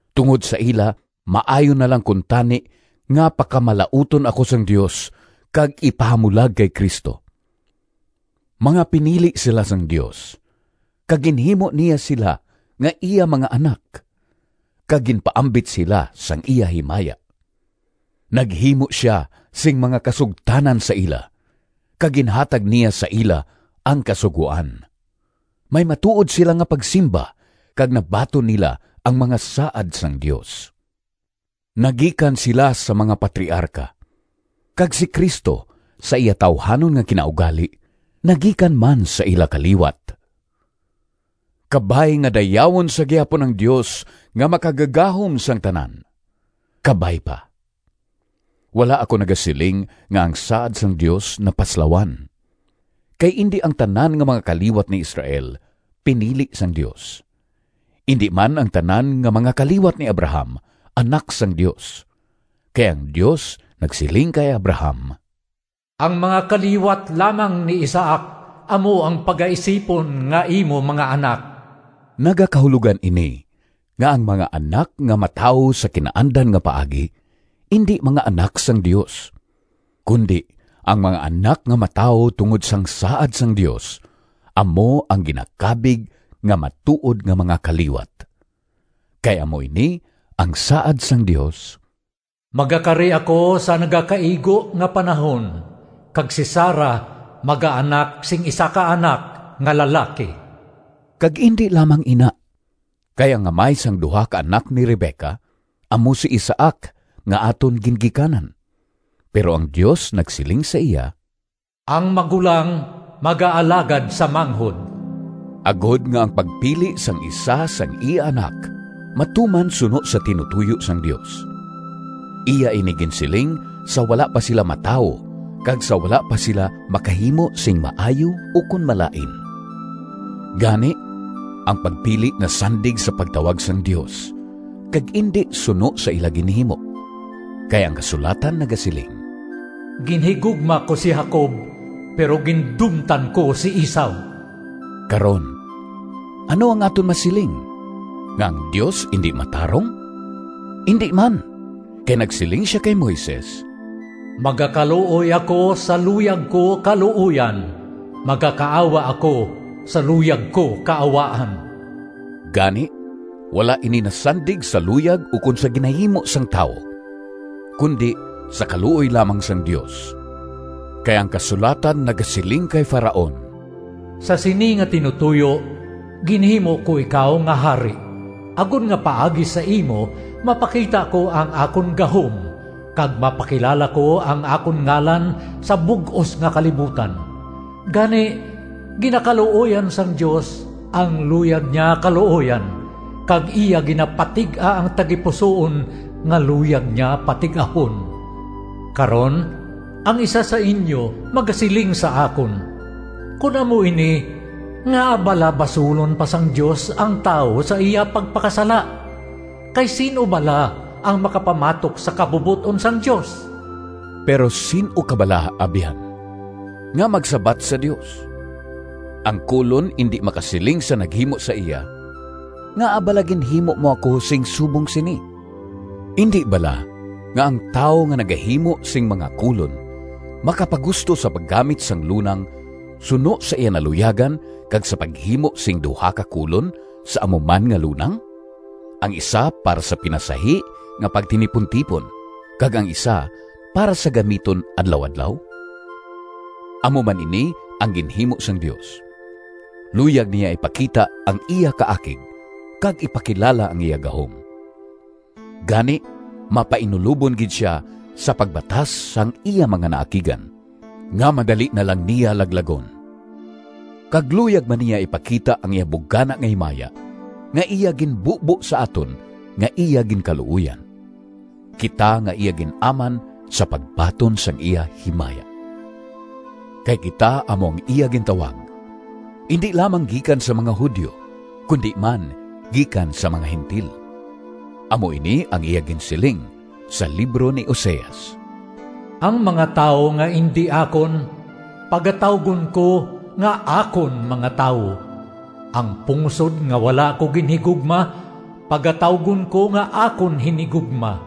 Tungod sa ila, maayo na lang kuntani nga pakamalauton ako sang Dios, kag ipahamulag kay Cristo. Mga pinili sila sang Dios, kag ginhimo niya sila nga iya mga anak, kag ginpaambit sila sang iya himaya. Naghimo sia sing mga kasugtanan sa ila, kag ginhatag niya sa ila ang Kasugoan. May matuod sila nga pagsimba kag nabaton nila ang mga saad sang Dios. Naggikan sila sa mga patriarka, kag si Cristo, sa iya tawuhanon nga kinaugali, naggikan man sa ila kaliwat. Kabay nga dayawon sa gihapon ang Dios nga Makagagahom sang tanan! Kabay pa. Wala ako nagasiling nga ang saad sang Dios napaslawan, kay indi ang tanan nga mga kaliwat ni Israel pinili sang Dios. Indi man ang tanan nga mga kaliwat ni Abraham anak sang Dios, kay ang Dios nagsiling kay Abraham, “Ang mga kaliwat lamang ni Isaac amo ang pagaisipon nga imo mga anak.” Nagakahulogan ini nga ang mga anak nga matawo sa kinaandan nga paagi indi mga anak sang Dios, kundi ang mga anak nga matawo tungod sang saad sang Dios amo ang ginakabig nga matuod nga mga kaliwat. Kay amo ini ang saad sang Dios, “Magakari ako sa nagakaigo nga panahon kag si Sara magaanak sing isa ka anak nga lalaki.” Kag indi lamang ina, kay ang amay sang duha ka anak ni Rebeca amo si Isaac nga aton gingikanan. Pero ang Dios nagsiling sa iya, “Ang magulang magaalagad sa manghod,” agod nga ang pagpili sang isa sang iya anak matuman suno sa tinutoyo sang Dios. Iya ini ginsiling sa wala pa sila matawo kag sa wala pa sila makahimo sing maayo ukon malain. Gani ang pagpili nasandig sa pagtawag sang Dios, kag indi suno sa ila ginhimo. Kay ang kasulatan nagasiling, “Ginhigugma ko si Jacob, pero gindumtan ko si Esau.” Karon, ano ang aton masiling? Nga ang Dios indi matarong? Indi man! Kay nagsiling sia kay Moises, “Magakaluoy ako sa luyag ko kaluoyan, magakaawa ako sa luyag ko kaawaan.” Gani wala ini nasandig sa luyag ukon sa ginahimo sang tawo, kundi sa kaluoy lamang sang Dios. Kay ang kasulatan nagasiling kay Faraon, “Sa sini nga tinutoyo ginhimo ko ikaw nga hari, agod nga paagi sa imo mapakita ko ang akon gahom kag mapakilala ko ang akon ngalan sa bug-os nga kalibutan.” Gani, ginakaluoyan sang Dios ang luyag niya kaluoyan, kag iya ginapatig-a ang tagipusoon nga luyag niya patig-ahon. Karon, ang isa sa inyo magasiling sa akon, “Kon amo ini, ngaa bala basulon pa sang Dios ang tawo sa iya pagpakasala? Kay sin-o bala ang makapamatok sa kabubot-on sang Dios?” Pero sin-o ka bala, abyan, nga magsabat sa Dios? Ang kolon indi makasiling sa naghimo sa iya, “Ngaa bala ginhimo mo ako sing subong sini?” Indi bala nga ang tawo nga nagahimo sing mga kolon makapagusto sa paggamit sang lunang suno sa iya naluyagan kag sa paghimo sing duha ka kolon sa amo man nga lunang, ang isa para sa pinasahi nga pagtinipuntipon kag ang isa para gamiton adlaw-adlaw? Amo man ini ang ginhimo sang Dios. Luyag niya ipakita ang iya kaakig kag ipakilala ang iya gahom. Gani, mapainulobon gid sia sa pagbatas sang iya mga naakigan, nga madali na lang niya laglagon. Kag luyag man niya ipakita ang iya bugana nga himaya, nga iya ginbubo sa aton nga iya ginkaluoyan, kita nga iya gin-aman sa pagbaton sang iya himaya. Kay kita amo ang iya gintawag, indi lamang gikan sa mga Judio kundi man gikan sa mga Gentil. Amo ini ang iya ginsiling sa libro ni Oseas: “Ang mga tawo nga indi akon, Pagatawgon ko nga ‘Akon mga Tawo.’ Ang pungsod nga wala ko ginhigugma, Pagatawgon ko nga ‘Akon Hinigugma.’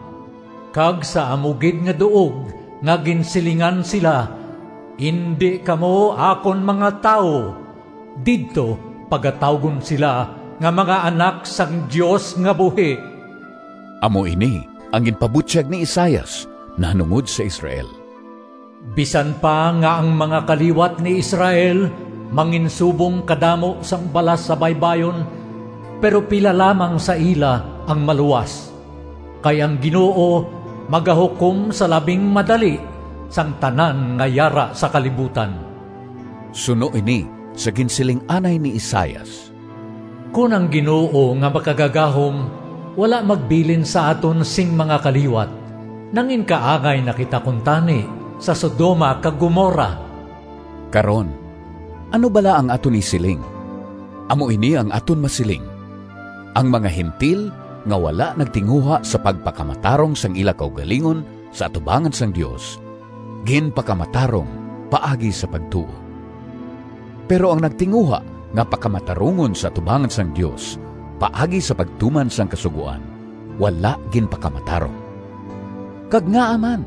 Kag sa amo gid nga duog Nga ginsilingan sila ‘Indi kamo akon mga tawo,’ Didto pagatawgon sila Nga mga anak sang Dios nga buhi.” Amo ini ang ginpabutyag ni Isaias nahanungod sa Israel, “Bisan pa nga ang mga kaliwat ni Israel manginsubong kadamo sang balas sa baybayon, pero pila lamang sa ila ang maluwas. Kay ang Ginoo magahukom sa labing madali sang tanan nga yara sa kalibutan.” Suno ini sa ginsiling anay ni Isaias, “Kon ang Ginoo nga Makagagahom wala magbilin sa aton sing mga kaliwat nanginkaangay na kita kuntani sa Sodoma kag Gomorra.” Karon, ano bala ang aton isiling? Amo ini ang aton masiling: ang mga Gentil nga wala nagtinguha sa pagpakamatarong sang ila kaugalingon sa atubangan sang Dios, ginpakamatarong paagi sa pagtuo. Pero ang nagtinguha nga pakamatarungon sa atubangan sang Dios paagi sa pagtuman sang kasugoan, wala ginpakamatarong. Kag ngaa man?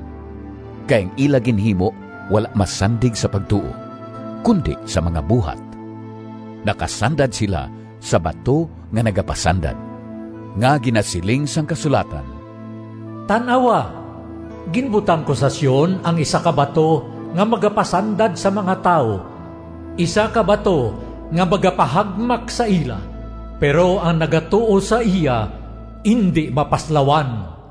Kay ang ila ginhimo wala masandig sa pagtuo, kundi sa mga buhat. Nakasandad sila sa “bato nga nagapasandad” nga ginasiling sang kasulatan: “Tan-awa, Ginbutang ko sa Sion Ang isa ka bato Nga magapasandad sa mga tawo, Isa ka bato Nga magapahagmak sa ila. Pero ang nagatuo sa iya Indi mapaslawan.”